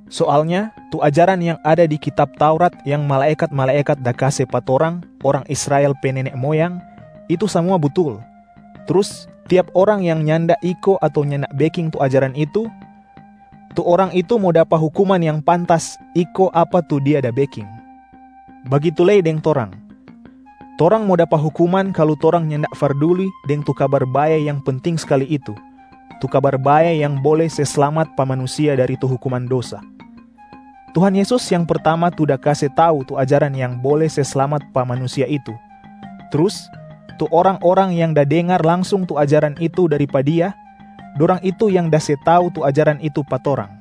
Soalnya tu ajaran yang ada di kitab Taurat yang malaekat-malaekat da kase pa torang orang Israel pe nene moyang, itu samua butul. Trus tiap orang yang nyanda iko ato nyanda beking tu ajaran itu, tu orang itu mo dapa hukuman yang pantas iko apa tu dia da beking. Bagitu lei deng torang, torang mo dapa hukuman kalu torang nyanda farduli deng tu Kabar Bae yang penting skali itu, tu Kabar Bae yang bole se slamat pa manusia dari tu hukuman dosa. Tuhan Yesus yang pertama tu da kase tau tu ajaran yang bole se slamat pa manusia itu, trus tu orang-orang yang da dengar langsung tu ajaran itu dari pa Dia, dorang itu yang da se tau tu ajaran itu pa torang.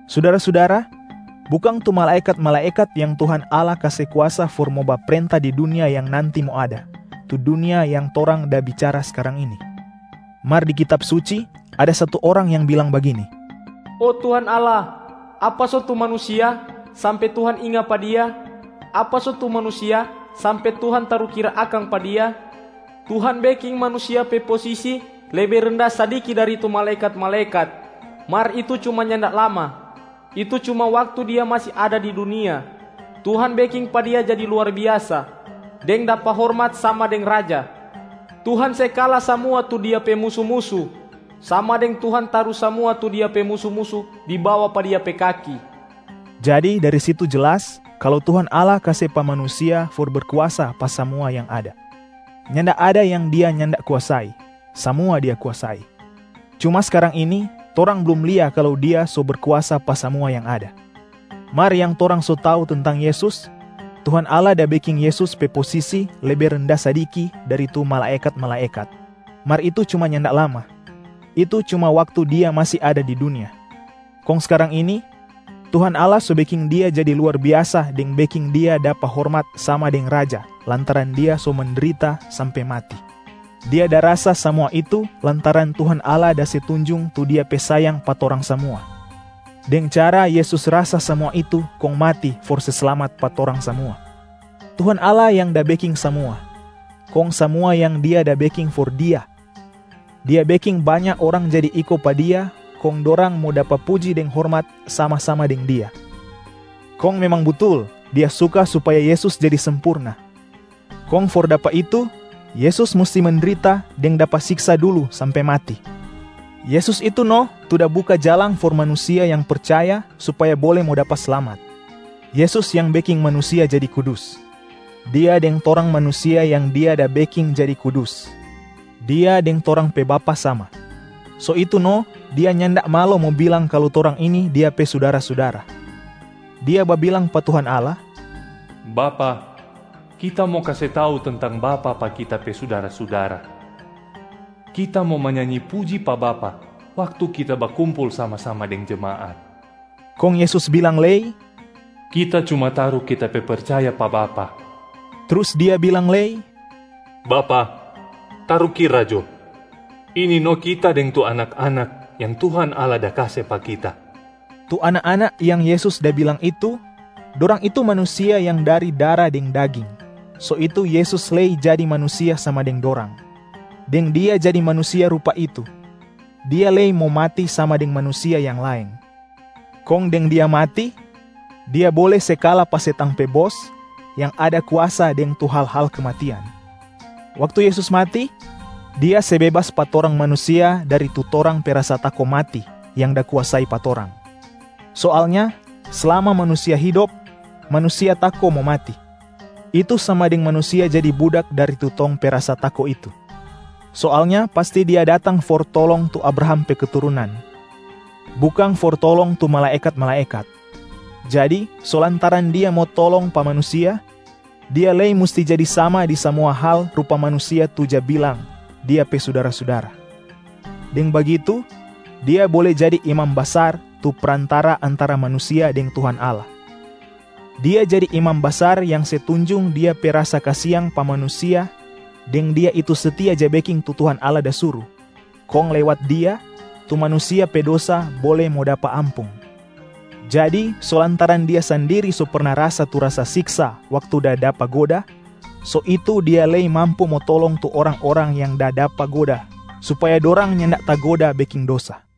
Sudara-sudara, bukang tu malaekat-malaekat yang Tuhan Allah kase kuasa for mo baprenta di dunia yang nanti mo ada, tu dunia yang torang da bicara skarang ini. Mar di Kitab Suci ada satu orang yang bilang bagini, “Oh Tuhan Allah, apa so tu manusia sampe Tuhan inga pa dia? Apa so tu manusia sampe Tuhan tarukira akang pa dia? Tuhan beking manusia pe posisi lebe renda sadiki dari tu malaekat-malaekat, mar itu cuma nyanda lama, itu cuma waktu dia masi ada di dunia. Tuhan beking pa dia jadi luar biasa, deng dapa hormat sama deng raja. Tuhan se kala samua tu dia pe musu-musu, sama deng Tuhan taru samua tu dia pe musu-musu di bawa pa dia pe kaki.” Jadi dari situ jelas kalu Tuhan Allah kase pa manusia for berkuasa pa samua yang ada. Nyanda ada yang dia nyanda kuasai, samua dia kuasai. Cuma skarang ini, torang blum lia kalu dia so berkuasa pa samua yang ada. Mar yang torang so tau tentang Yesus, Tuhan Allah da beking Yesus pe posisi lebe renda sadiki dari tu malaekat-malaekat, mar itu cuma nyanda lama, itu cuma waktu Dia masi ada di dunia. Kong skarang ini, Tuhan Allah so beking Dia jadi luar biasa deng beking Dia dapa hormat sama deng Raja lantaran Dia so mendrita sampe mati. Dia da rasa samua itu lantaran Tuhan Allah da se tunjung tu Dia pe sayang pa torang samua deng cara Yesus rasa samua itu kong mati for se slamat pa torang samua. Tuhan Allah yang da beking samua, kong samua yang Dia da beking for Dia. Dia beking banya orang jadi iko pa Dia kong dorang mo dapa puji deng hormat sama-sama deng Dia. Kong memang butul Dia suka supaya Yesus jadi sempurna, kong for dapa itu Yesus musti mendrita deng dapa siksa dulu sampe mati. Yesus itu no tu da buka jalang for manusia yang percaya supaya bole mo dapa slamat. Yesus yang beking manusia jadi kudus. Dia deng torang manusia yang Dia da beking jadi kudus, Dia deng torang pe Bapa sama. So itu no Dia nyanda malo mo bilang kalu torang ini Dia pe sudara-sudara. Dia babilang pa Tuhan Allah, “Bapa, Kita mo kase tau tentang Bapa pa Kita pe sudara-sudara. Kita mo manyanyi puji pa Bapa waktu Kita bakumpul sama-sama deng jemaat.” Kong Yesus bilang lei, “Kita cuma taru Kita pe percaya pa Bapa.” Trus Dia bilang lei, “Bapa, tarukira jo, ini no Kita deng tu anak-anak yang Tuhan Allah da kase pa Kita.” Tu anak-anak yang Yesus da bilang itu, dorang itu manusia yang dari dara deng daging, so itu Yesus lei jadi manusia sama deng dorang. Deng Dia jadi manusia rupa itu, Dia lei mo mati sama deng manusia yang laeng. Kong deng Dia mati, Dia bole se kala pa setang pe bos yang ada kuasa deng tu hal-hal kematian. Waktu Yesus mati, Dia se bebas pa torang manusia dari tu torang pe rasa tako mati yang da kuasai pa torang. Soalnya slama manusia hidop, manusia tako mo mati, itu sama deng manusia jadi budak dari tu tong pe rasa tako itu. Soalnya pasti Dia datang for tolong tu Abraham pe keturunan, bukang for tolong tu malaekat-malaekat. Jadi so lantaran Dia mo tolong pa manusia, Dia lei musti jadi sama di samua hal rupa manusia tu ja bilang Dia pe sudara-sudara. Deng bagitu, Dia bole jadi Imam Basar tu prantara antara manusia deng Tuhan Allah, Dia jadi imam basar yang se tunjung Dia pe rasa kasiang pa manusia deng Dia itu setia ja beking tu Tuhan Allah da suru, kong lewat Dia, tu manusia pe dosa bole mo dapa ampung. Jadi so lantaran Dia sandiri so perna rasa tu siksa waktu da dapa goda, so itu Dia lei mampu mo tolong tu orang-orang yang da dapa goda supaya dorang nyanda tagoda beking dosa.